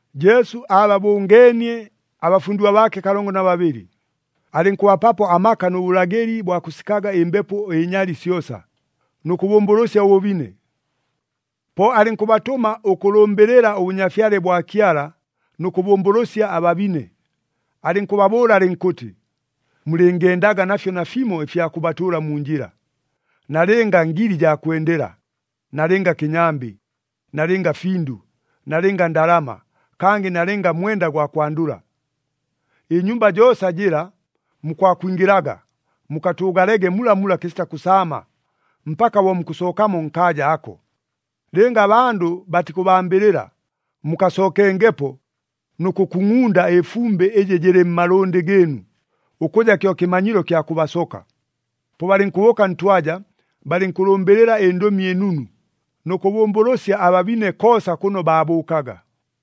Jesu aababʉngeenie abafundigwa baake kalongo na babɨlɨ. Alɨnkʉbapapo amaka nʉ bʉlagɨli bwa kʉsikaga ɨmbepo ɨnyali syosa, nʉ kʉbʉmbʉlʉsya ʉbʉbine. Po alɨnkʉbatʉma ʉkʉlʉmbɨlɨla ʉBʉnyafyale bwa Kyala nʉ kʉbʉmbʉlʉsya ababine. Alɨnkʉbabʉʉla alɨnkʉtɨ, “Mulɨngendaga nafyo nafimo ɨfya kʉbatʉʉla mu njɨla, nalɨnga ngili jaa kwendela, nalɨnga kɨnyambɨ, nalɨnga findʉ, nalɨnga ndalama, kangɨ nalɨnga mwenda gwa kwandʉla. Ɨnyumba joosa jɨla mukwakwingɨlaga, mukatʉʉgalege mulamula kɨsita kʉsaama, mpaka bo mukʉsookamo nkaaja ako. Lɨnga abandʉ batikʉbambɨlɨla, mukasookengepo nʉ kʉkungʼunda ɨfumbɨ ɨjɨ jɨlɨ mmalʉndɨ gɨɨnu, ʉkʉja kyo kɨmanyilo kya kʉbasoka.” Po balɨnkʉbʉʉka ntwaja, balɨnkʉlʉmbɨlɨla ɨNdʉmi ɨNunu, nʉ kʉbʉmbʉlʉsya ababine koosa kʉno baabʉʉkaga.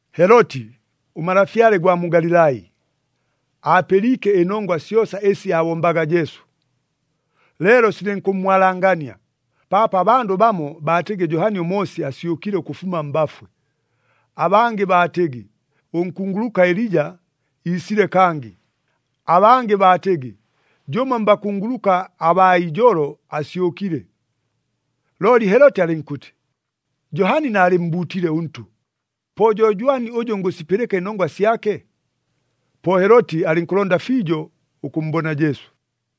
Heloti, ʉmalafyale ʉgwa mu Galilai, aapɨliike ɨnongwa syosa ɨsi aabombaga Jesu. Leelo silɨnkʉmmwalangania, paapo abandʉ bamo baatɨgɨ Johani ʉMoosi asyʉkile ʉkʉfuma mbafwe. Abangɨ baatɨgɨ, ʉnkunguluka Elija iisile kangɨ. Abangɨ baatɨgɨ, jʉmo mbakunguluka abaa ijolo asyʉkile. Looli Heloti alɨnkʉtɨ, “Johani naalɨmmbuutile ʉntʉ! Po jo jwani ʉjʉ ngʉsipɨlɨka ɨnongwa syake?” Po Heloti alɨnkʉlonda fiijo ʉkʉmmbona Jesu.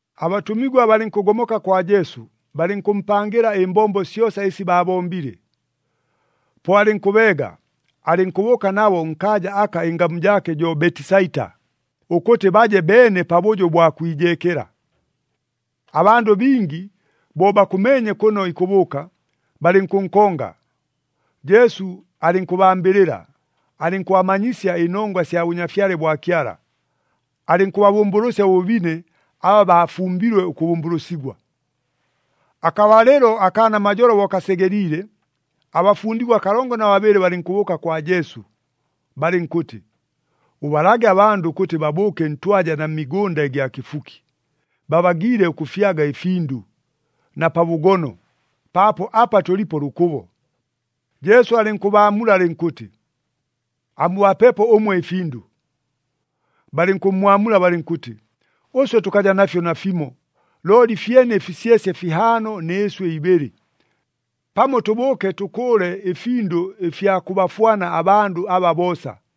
Abatʉmigwa balɨnkʉgomoka kwa Jesu, balɨnkʉmpangɨla ɨmbombo syosa ɨsi baabombile. Po alɨnkʉbeega, alɨnkʉbʉʉka nabo nkaaja aka ɨngamu jaake jo Betisaita, ʉkʉtɨ baje beene pabʉjo ʉbwa kwijeekela. Abandʉ bingi bo bakʉmeenye kʉno ikʉbʉʉka, balɨnkʉnkonga. Jesu alɨnkʉbambɨlɨla, alɨnkʉbamanyisya ɨnongwa sya Bʉnyafyale bwa Kyala. Alɨnkʉbabʉmbʉlʉsya ʉbʉbine, aba baafumbilwe ʉkʉbʉmbʉlʉsigwa. Akabalɨlo akaa namajolo bo kasegeliile, abafundigwa kalongo na babɨlɨ balɨnkʉbʉʉka kwa Jesu, balɨnkʉtɨ, “Ʉbalage abandʉ ʉkʉtɨ babʉʉke ntwaja na mmigʉnda ɨgya kɨfuki, babagiile ʉkʉfyaga ɨfindʉ na pa bʉgono, paapo apa tʉlipo lʉkʉbo.” Jesu alɨnkʉbaamula alɨnkʉtɨ, “Amubapepo ʉmwe ɨfindʉ.” Balɨnkʉmmwamula balɨnkʉtɨ, “Ʉswe tʉkaja nafyo nafimo, looli fyene ɨfisyesye fihaano nɨ ɨswɨ ibɨlɨ. Pamo tʉbʉʉke tʉkʉʉle ɨfindʉ ɨfya kʉbafwana abandʉ aba boosa!”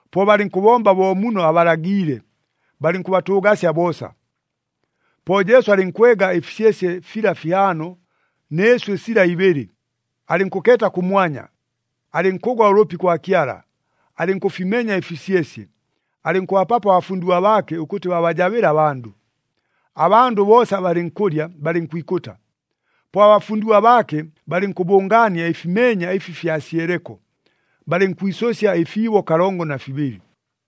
Po balɨnkʉbomba bo muno abalagɨliile, balɨnkʉbatʉʉgasya boosa. Po Jesu alɨnkwega ɨfisyesye fila fihaano, nɨ ɨswɨ sila ibɨlɨ, alɨnkʉkeeta kʉmwanya, alɨnkʉgwa ʉlʉpi kwa Kyala, alɨnkʉfimenya ɨfisyesye, alɨnkʉbapapo abafundigwa baake ʉkʉtɨ babajabɨle abandʉ. Abandʉ boosa balɨnkʉlya, balɨnkwikʉta. Po abafundigwa baake balɨnkʉbʉngaania ɨfimeenya ɨfi fyasyeleko, balɨnkwisʉsya ɨfiibo kalongo na fibɨlɨ.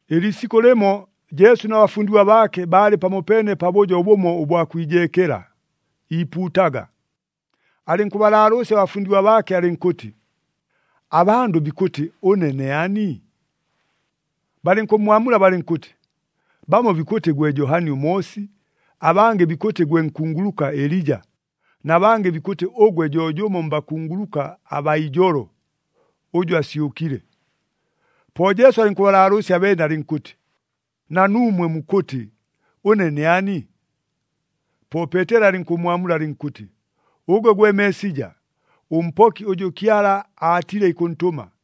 Ɨliisikʉ lɨmo, Jesu na bafundigwa baake baalɨ pamopeene pabʉjo bʉmo ʉbwa kwijeekela, iipuutaga. Alɨnkʉbalaalʉʉsya abafundigwa baake alɨnkʉtɨ, “Abandʉ bikʉtɨ, ʉne ne ani?” Balɨnkʉmmwamula balɨnkʉtɨ, “Bamo bikʉtɨ gwe Johani ʉMoosi, abangɨ bikʉtɨ gwe nkunguluka Elija, na bangɨ bikʉtɨ ʉgwe jo jʉmo mbakunguluka abaa ijolo, ʉjʉ asyʉkile.” Po Jesu alɨnkʉbalaalʉʉsya abeene, alɨnkʉtɨ, “Na nuumwe mukʉtɨ, ʉne ne ani?” Po Peeteli alɨnkʉmmwamula alɨnkʉtɨ, “Ʉgwe gwe Meesija, ʉMpoki ʉjʉ Kyala aatile ikʉntʉma.”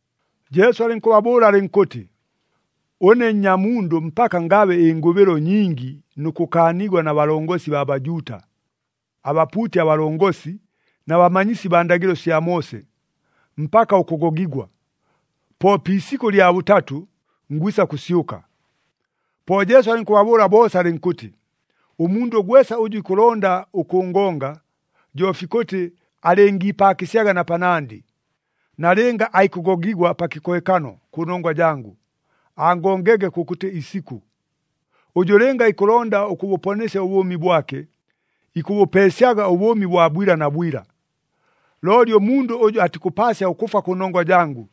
Jesu alɨnkʉbabʉʉla alɨnkʉtɨ, “Ʉne Nnyamundʉ mpaka ngabe ɨngʉbɨlo nyingi nʉ kʉkaanigwa na balongosi baa Bajuuta, abapuuti abalongosi na bamanyisi baa ndagɨlo sya Moose, mpaka ʉkʉgogigwa. Po pi isikʉ lya bʉtatʉ, ngwisa kʉsyʉka.” Po Jesu alɨnkʉbabʉʉla boosa alɨnkʉtɨ, “Ʉmundʉ gwesa ʉjʉ ikʉlonda ʉkʉngonga, jo fikʉtɨ alɨngiipaakɨsyaga na panandɨ, nalɨnga aikʉgogigwa pa kɨkohekano kʉnongwa jangʉ, angongege kʉkʉtɨ isikʉ. Ʉjʉ lɨnga ikʉlonda ʉkʉbʉponesya ʉbʉʉmi bwake, ikʉbʉpeesyaga ʉbʉʉmi bwa bwila na bwila. Looli ʉmundʉ ʉjʉ atikʉpaasya ʉkʉfwa kʉnongwa jangʉ,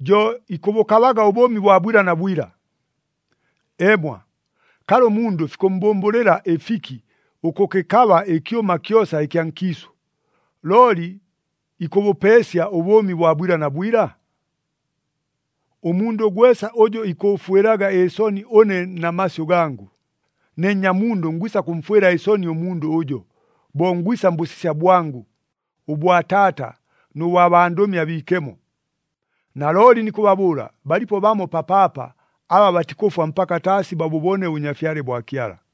jo ikʉbʉkabaga ʉbʉʉmi bwa bwila na bwila. Eemwa, kalɨ ʉmundʉ fikʉmmbʉmbʉlɨla ɨfiki ʉkʉkɨkaba ɨkyʉma kyosa ɨkya nkiisʉ, looli ikʉbʉpeesya ʉbʉʉmi bwa bwila na bwila? Ʉmundʉ gwesa ʉjʉ ikʉʉfwɨlaga ɨsoni ʉne na masyʉ gangʉ, ne Nnyamundʉ ngwisa kʉmfwɨla ɨsoni ʉmundʉ ʉjo, bo ngwisa mbʉsisya bwangʉ, ʉbwa Taata nʉ bwa bandʉmi abiikemo. Nalooli nikʉbabʉʉla, balipo bamo papaapa aba batikʉfwa mpaka taasi babʉbone ʉBʉnyafyale bwa Kyala.”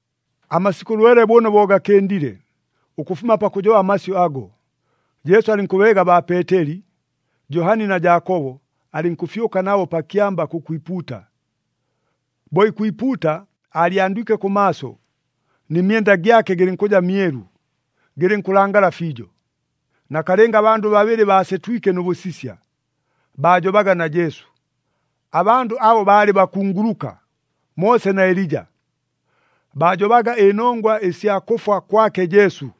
Amasikʉ lwele bʉno bo gakɨndile, ʉkʉfuma pakʉjoba amasyʉ ago, Jesu alɨnkʉbeega baa Peeteli, Johani na Jaakobo, alɨnkʉfyʉka nabo pa kyamba kʉkwipuuta. Bo ikwipuuta, aalyandwike kʉmaaso, nɨ myenda gyake gɨlɨnkʉja myelu, gɨlɨnkʉlangala fiijo. Nakalɨnga abandʉ babɨlɨ baasetwike nʉ bʉsisya, baajobaga na Jesu. Abandʉ abo baalɨ bakunguluka, Moose na Elija. Baajobaga ɨnongwa ɨsya kʉfwa kwake Jesu,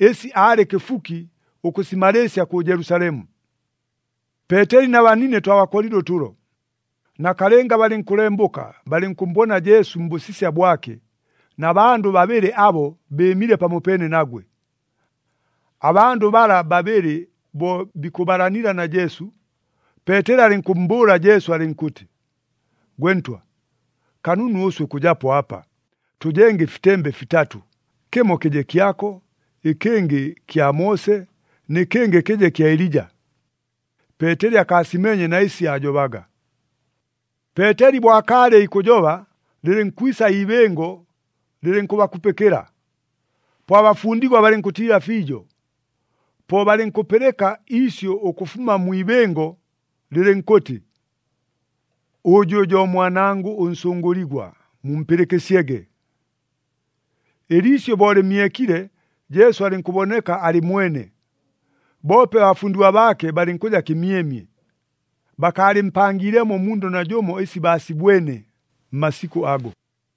ɨsi aalɨ kɨfuki ʉkʉsimalɨɨsya kʉ Jelusalemu. Peeteli na banine twabakolile ʉtʉlo. Nakalɨnga balɨnkʉlembʉka balɨnkʉmmbona Jesu mbʉsisya bwake na bandʉ babɨlɨ abo bɨɨmile pamopeene nagwe. Abandʉ bala babɨlɨ bo bikʉbalanila na Jesu, Peeteli alɨnkʉmmbʉʉla Jesu alɨnkʉtɨ, “Gwe Ntwa, kanunu ʉswe ʉkʉjapo apa. Tʉjenge ɨfitembe fitatʉ. Kɨmo kɨje kyako, ɨkɨngɨ kya Moose, nɨ kɨngɨ kɨje kya Elija.” Peeteli akaasimeenye na ɨsi aajobaga. Peeteli bo akaalɨ ikʉjoba, lɨlɨnkwisa iibɨngo lɨlɨnkʉbakupɨkɨla. Po abafundigwa balɨnkʉtiila fiijo. Po balɨnkʉpɨlɨka iisyʉ ʉkʉfuma mwi ibɨngo, lɨlɨnkʉtɨ, “Ʉjʉ jo Mwanangʉ ʉNsʉngʉligwa, mumpɨlɨkɨsyege!” Ɨliisyʉ bo lɨmyekile, Jesu alɨnkʉboneka alɨ mwene. Boope abafundigwa baake balɨnkʉja kɨmyemye, bakaalɨmpangiilemo ʉmundʉ najʉmo ɨsi baasibwene, mmasikʉ ago.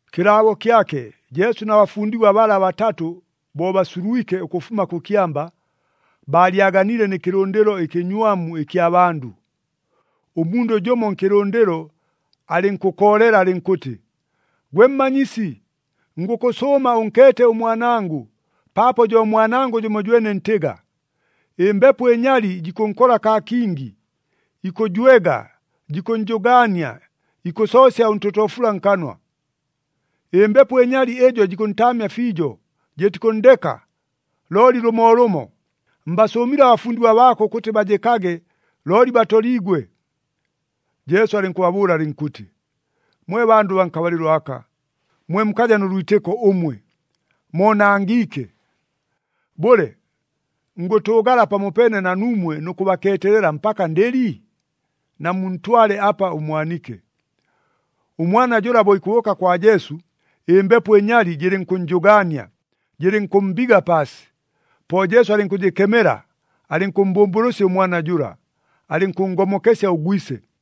Kɨlaabo kyake, Jesu na bafundigwa bala batatʉ bo basulwike ʉkʉfuma kʉ kyamba, baalyaganiile nɨ kɨlʉndɨlo ɨkɨnywamu ɨkya bandʉ. Ʉmundʉ jʉmo nkɨlʉndɨlo alɨnkʉkoolela alɨnkʉtɨ, “Gwe Mmanyisi, ngʉkʉsʉʉma ʉnkeete ʉmwanangʉ, paapo jo mwanangʉ jʉmojwene ntɨga. Ɨmbepo ɨnyali jikʉnkola kaa kingi, ikʉjwega, jikʉnnjʉgaania ikʉsoosya ʉntotoofula nkanwa. Ɨmbepo ɨnyali ɨjo jikʉntaamya fiijo, jɨtikʉnndeka, looli lʉmoolʉmo. Mbasʉʉmile abafundigwa baako ʉkʉtɨ bajɨkage, looli batoliigwe.” Jesu alɨnkʉbabʉʉla alɨnkʉtɨ, “Mwe bandʉ baa nkabalɨlo aka, mwe mukaja nʉ lwitɨko ʉmwe! Moonangiike! Bʉle, ngʉtʉʉgala pamopeene na nuumwe nʉ kʉbakeetelela mpaka ndɨli? Namuntwale apa ʉmwanike.” Ʉmwana jʉla bo ikʉbʉʉka kwa Jesu, ɨmbepo ɨnyali jɨlɨnkʉnnjʉgaania, jɨlɨnkʉmmbiga paasi. Po Jesu alɨnkʉjɨkemela, alɨnkʉmmbʉmbʉlʉsya ʉmwana jʉla, alɨnkʉnngomokesya ʉgwise.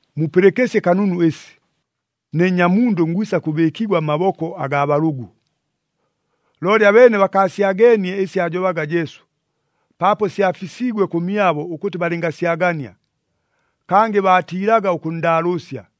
“Mupɨlɨkɨsye kanunu ɨsi. Ne Nnyamundʉ ngwisa kʉbɨɨkigwa mmaboko agaa balʉgʉ.” Looli abeene bakaasyageenie ɨsi aajobaga Jesu, paapo syafisiigwe kʉmyabo ʉkʉtɨ balɨngasyagania. Kangɨ baatiilaga ʉkʉnndaalʉʉsya.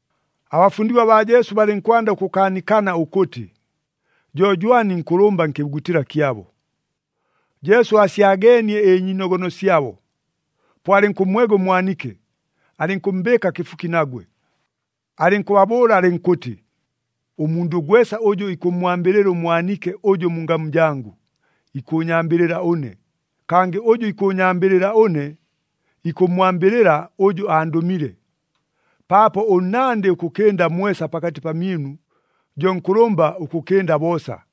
Abafundigwa baa Jesu balɨnkwanda ʉkʉkaanikana ʉkʉtɨ, jo jwani nkʉlʉmba nkɨbugutɨla kyabo. Jesu aasyageenie ɨnyiinogono syabo. Po alɨnkʉmmwega ʉmwanike, alɨnkʉmmbɨɨka kɨfuki nagwe. Alɨnkʉbabʉʉla alɨnkʉtɨ, “Ʉmundʉ gwesa ʉjʉ ikʉmmwambɨlɨla ʉmwanike ʉjʉ mu ngamu jangʉ, ikʉʉnyambɨlɨla ʉne. Kangɨ ʉjʉ ikʉʉnyambɨlɨla ʉne, ikʉmmwambɨlɨla ʉjʉ andʉmile. Paapo ʉnnandɨ ʉkʉkɨnda mwesa pakatɨ pamyɨnu, jo nkʉlʉmba ʉkʉkɨnda boosa.”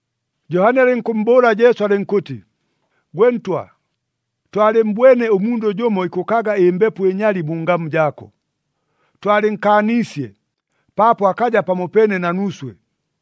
Johani alɨnkʉmmbʉʉla Jesu alɨnkʉtɨ, “Gwe Ntwa, twalɨmmbwene ʉmundʉ jʉmo ikʉkaga ɨmbepo ɨnyali mu ngamu jaako. Twalɨnkaaniisye, paapo akaja pamopeene na nuuswe.”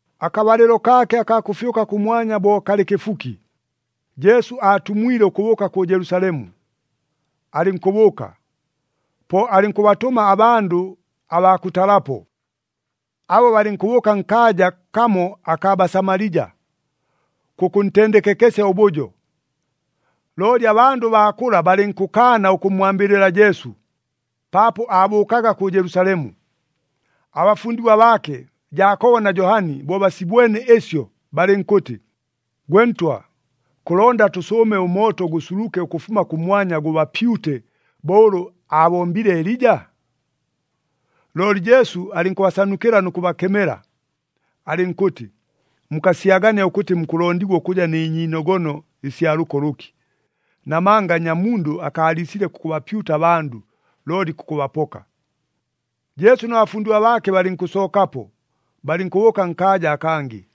Akabalɨlo kaake akaa kʉfyʉka kʉmwanya bo kalɨ kɨfuki, Jesu aatumwile ʉkʉbʉʉka kʉ Jelusalemu, alɨnkʉbʉʉka. Po alɨnkʉbatʉma abandʉ abaa kʉtalapo, abo balɨnkʉbʉʉka nkaaja kamo akaa Basamalija, kʉkʉntendekekesya ʉbʉjo. Looli abandʉ baa kʉla balɨnkʉkaana ʉkʉmmwambɨlɨla Jesu, paapo aabʉʉkaga kʉ Jelusalemu. Abafundigwa baake, Jaakobo na Johani, bo basibwene ɨsyo balɨnkʉtɨ, “Gwe Ntwa, kʉlonda tʉsʉʉme ʉmooto gʉsuluke ʉkʉfuma kʉmwanya gʉbapyute [bo ʉlʉ aabombile Elija]?” Looli Jesu alɨnkʉbasanukɨla nʉ kʉbakemela. [Alɨnkʉtɨ, “Mukasyagania ʉkʉtɨ mukʉlondigwa ʉkʉja nɨ nyiinogono ɨsya lʉko lʉki. Namanga Nnyamundʉ akaaliisile kʉkʉbapyuta abandʉ looli kʉkʉbapoka.”] Jesu na bafundigwa baake balɨnkʉsookapo, balɨnkʉbʉʉka nkaaja akangɨ.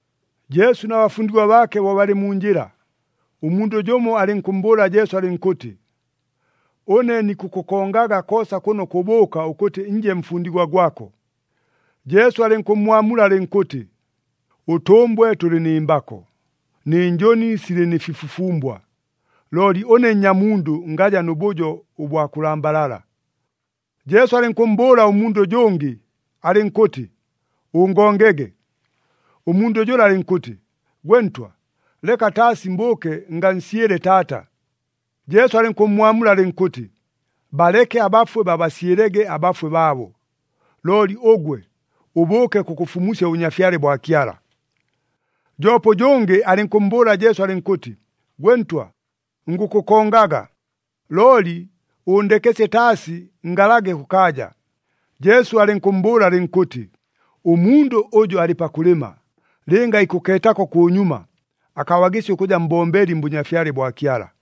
Jesu na bafundigwa baake bo balɨ mu njɨla, ʉmundʉ jʉmo alɨnkʉmmbʉʉla Jesu alɨnkʉtɨ, “Ʉne nikʉkʉkongaga koosa kʉno kʉbʉʉka ʉkʉtɨ nje mfundigwa gwako!” Jesu alɨnkʉmmwamula alɨnkʉtɨ, “Ʉtʉmbwe tʉlɨ nɨ mbako, nɨ njʉni silɨ nɨ fifufumbwa, looli ʉne Nnyamundʉ ngaja nʉ bʉjo ʉbwa kʉlambalala.” Jesu alɨnkʉmmbʉʉla ʉmundʉ ʉjʉngɨ, alɨnkʉtɨ, “Ʉngongege!” Ʉmundʉ jʉla alɨnkʉtɨ, “Gwe Ntwa, leka taasi mbʉʉke ngansyɨle taata.” Jesu alɨnkʉmmwamula alɨnkʉtɨ, “Baleke abafwe babasyɨlege abafwe baabo. Looli ʉgwe, ʉbʉʉke kʉkʉfumusya ʉBʉnyafyale bwa Kyala.” Joope ʉjʉngɨ alɨnkʉmmbʉʉla Jesu alɨnkʉtɨ, “Gwe Ntwa, ngʉkʉkongaga, looli ʉʉndekesye taasi ngalage kʉkaaja.” Jesu alɨnkʉmmbʉʉla alɨnkʉtɨ, “Ʉmundʉ ʉjʉ alɨ pakʉlɨma, lɨnga ikʉkeetako kʉnyuma, akabagɨsya ʉkʉja mbombeli mBʉnyafyale bwa Kyala.”